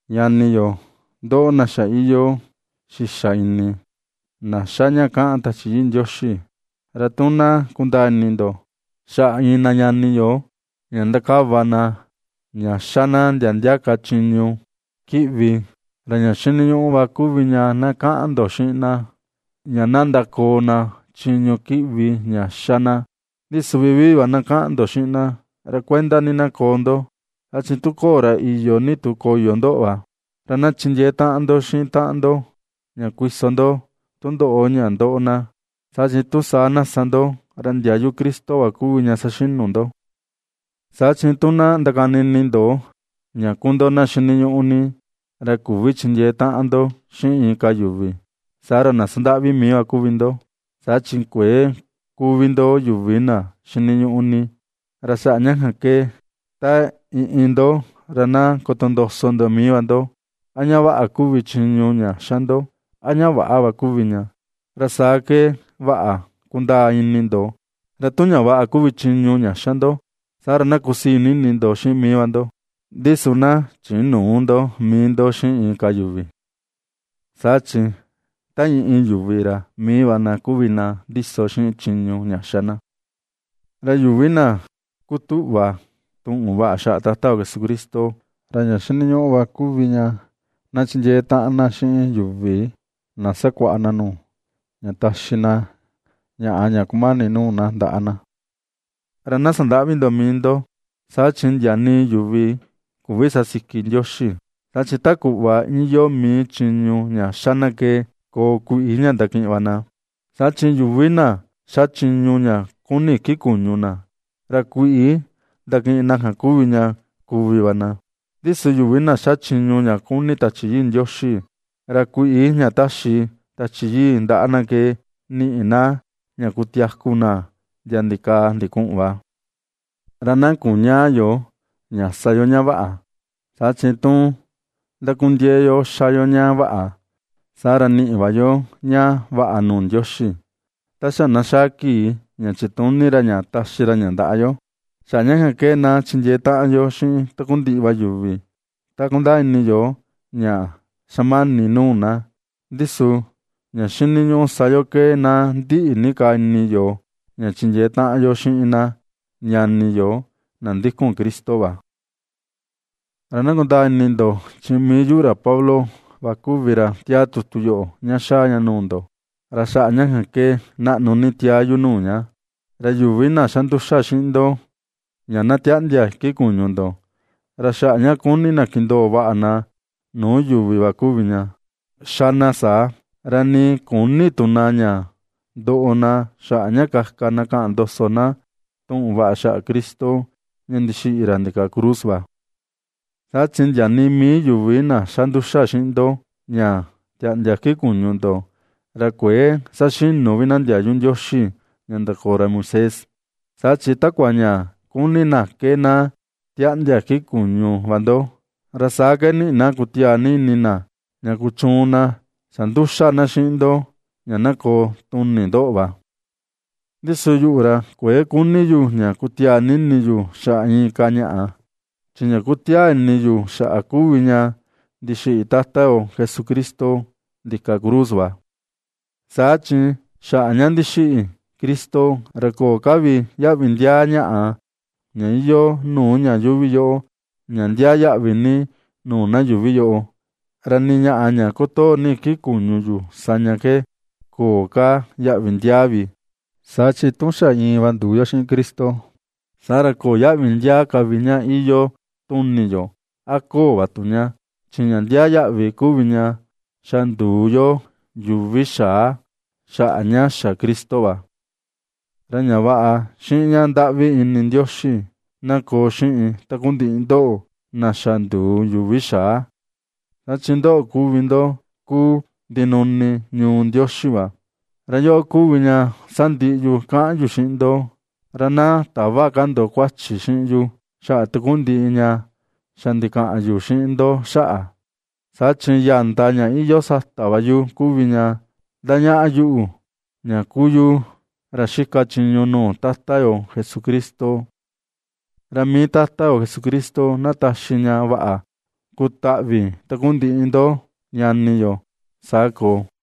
Ñani yo, ndoꞌo na xa iyoo xixa ini, na ^xa ña kaꞌan Tachi Yii Ndioxi, ra tu na kundaa ini ndo xaꞌa iin na ñani yo ña ndakava na ña ^xa na ndia ndia ka chiñu kiꞌvi, ra ña xiniñuꞌu va kuvi ña na kaꞌan ndo xiꞌin na, ña na ndakoo na chiñu kiꞌvi ña ^xa na. Ndi su vivii va na kaꞌan ndo xiꞌin na, ra kuenda ni na koo ndo, saa chi tu köo ra iyo ini tu koyo ndoꞌo va. Ra na chindiee taꞌan ndo xiꞌin taꞌan ndo ña kuiso ndo tundoꞌo ña ndoꞌo na, saa chi tu saa na sa ndo, ra ndiayu Cristo va kuvi ña saxinu ndo. Saa chi tu na ndakani ini ndo ña kuu ndo na xiniñuꞌu ni, ra küvi chindiee taꞌan ndo xiꞌin inka yuvi, saa ra na sandaꞌvi mii va kuvi ndo, saa chi kuëe kuu vi ndo yuvi na xiniñuꞌu ni. Ra xaꞌa ña kan ke, ta iin iin ndo ra na kotondoso ndo mii va ndo a ña vaꞌa kuvi chiñu ña xa ndo a ña väꞌa va kuvi ña, ra saa ke vaꞌa kundaa ini ndo, ra tu ña vaꞌa kuvi chiñu ña xa ndo, saa ra na kusii ni ini ndo xiꞌin mii va ndo, ndi su na chinüu ndo mii ndo xiꞌin inka yuvi. Saa chi ta iin iin yuvi ra mii va na kuvi na ndiso xiꞌin chiñu ña xa na. Ra yuvi na ^kutuꞌva tuꞌun vaꞌa xaꞌa Tata Jesucristo, ra ña xiniñuꞌu va kuvi ña na chindiee taꞌan na xiꞌin yuvi na ^sakuaꞌa na nuu, ña taxi na ñaꞌa ña kumani nuu na ndaꞌa na. Ra na sandäꞌvi ndo mii ndo, saa chi ndia nii yuvi küvi sasiki Ndioxi. Saa chi ta kuꞌva iyoo mii chiñu ña xa na ke koo kuiꞌi ña ndakiꞌin va na. Saa chi yuvi na ^xa chiñu ña kuni iki kuñu na, ra kuiꞌi ña ndakiꞌin na kuvi ña kuvi va na. Ndi su yuvi na xa chiñu ña kuni Tachi Yii Ndioxi, ra kuiꞌi ña taxi Tachi Yii ndaꞌa na ke niꞌi na ña kutiaku na ndia ndikaa ndikuꞌun va. Ra na kuñäa yo, ña sa yo ña vaꞌa, saa chi tu ndakundiee yo ^xa yo ña vaꞌa, saa ra niꞌi va yo ña vaꞌa nuu Ndioxi, ta xa na xaa kii ña chituni ra ña taxi ra ña ndaꞌa yo. Xaꞌa ña kan ke na chindiee taꞌan yo xiꞌin takundiꞌi va yuvi ta kundaa ini yo ña xa mani nuu na, ndi su ña xiniñuꞌu sa yo ke na ndiꞌi ni ka va ini yo ña chindiee taꞌan yo xiꞌin na ñani yo na ndikun Cristo va. Ra na kundaa ini ndo, chi mii yuꞌu Pablo va kuvi ra tiaa tutu yoꞌo ña xaa ña nuu ndo, ra xaꞌa ña kan ke naꞌnu ni tiaa yu nuu ña. Ra yuvi na xa nduxa xiꞌin ndo ña na tiaꞌndia iki kuñu ndo, ra xaꞌa ña kuni na kindoo vaꞌa na nuu yuvi va kuvi ña, ^xa na saa, ra nii küni tu na ña ndoꞌo na xaꞌa ña kaka na kaꞌan ndoso na tuꞌun vaꞌa xaꞌa Cristo ña ndixiꞌi ra ndika cruz va. Saa chi ndia nii mii yuvi na xa nduxa xiꞌin ndo, ña tiaꞌndia iki kuñu ndo, ra kuëe saxinu vi na ndiayu Ndioxi ña ndakoo ra Moisés. Saa chi takua ña kuni na ke na tiaꞌndia iki kuñu va ndo, ra saa ke niꞌi na kutiaa ini na ña kuchuun na xa nduxa na xiꞌin ndo ña na koo tuni ndoꞌo va. Ndi su yuꞌu, ra kuëe kuni yu ña kutiaa ini yu xaꞌa inka ñaꞌa, chi ña kutiaa ini yu xaꞌa kuvi ña ndixiꞌi Tata yo Jesucristo ndika cruz va. Saa chi xaꞌa ña ndixiꞌi Cristo, ra köo ka vi yaꞌvi ndiaa ñaꞌa ña iyoo nuu ña yuuvi ña ndiaa yaꞌvi ni nuu na yuꞌvi yoꞌo, ra nii ñaꞌa ña kutoo ni iki kuñu yu sa ña ke köo ka yaꞌvi ndiaa vi. Saa chi tu xa iin va nduu yo xiꞌin Cristo, saa ra köo yaꞌvi ndiaa ka vi ña iyoo tuni yoo a ña köo va tu ña; chi ña ndiaa yaꞌvi kuvi ña xa nduu yo yuvi xaa xaꞌa ña xa Cristo va. Ra ña vaꞌa xiꞌin ña ndaꞌvi ini Ndioxi na koo xiꞌin takundiꞌi ndoꞌo na xa nduu yuvi xaa, saa chi ndoꞌo kuvi ndo kuu ndinuni ñuu Ndioxi va. Ra yoꞌo kuvi ña sandiꞌi yu kaꞌan yu xiꞌin ndo: ra na täva ka ndo kuachi xiꞌin yu xaꞌa takundiꞌi ña xa ndikaꞌan yu xiꞌin ndo xaꞌa, saa chi ya̱ndà ña iyoo sata va yu kuvi ña ndañaꞌa yuꞌu ña ^kuu yu, ra xika chiñu nuu Tata yo Jesucristo. Ra mii Tata yo Jesucristo, na taxi ña vaꞌa kutaꞌvi takundiꞌi ndo ñani yo. Saa koo.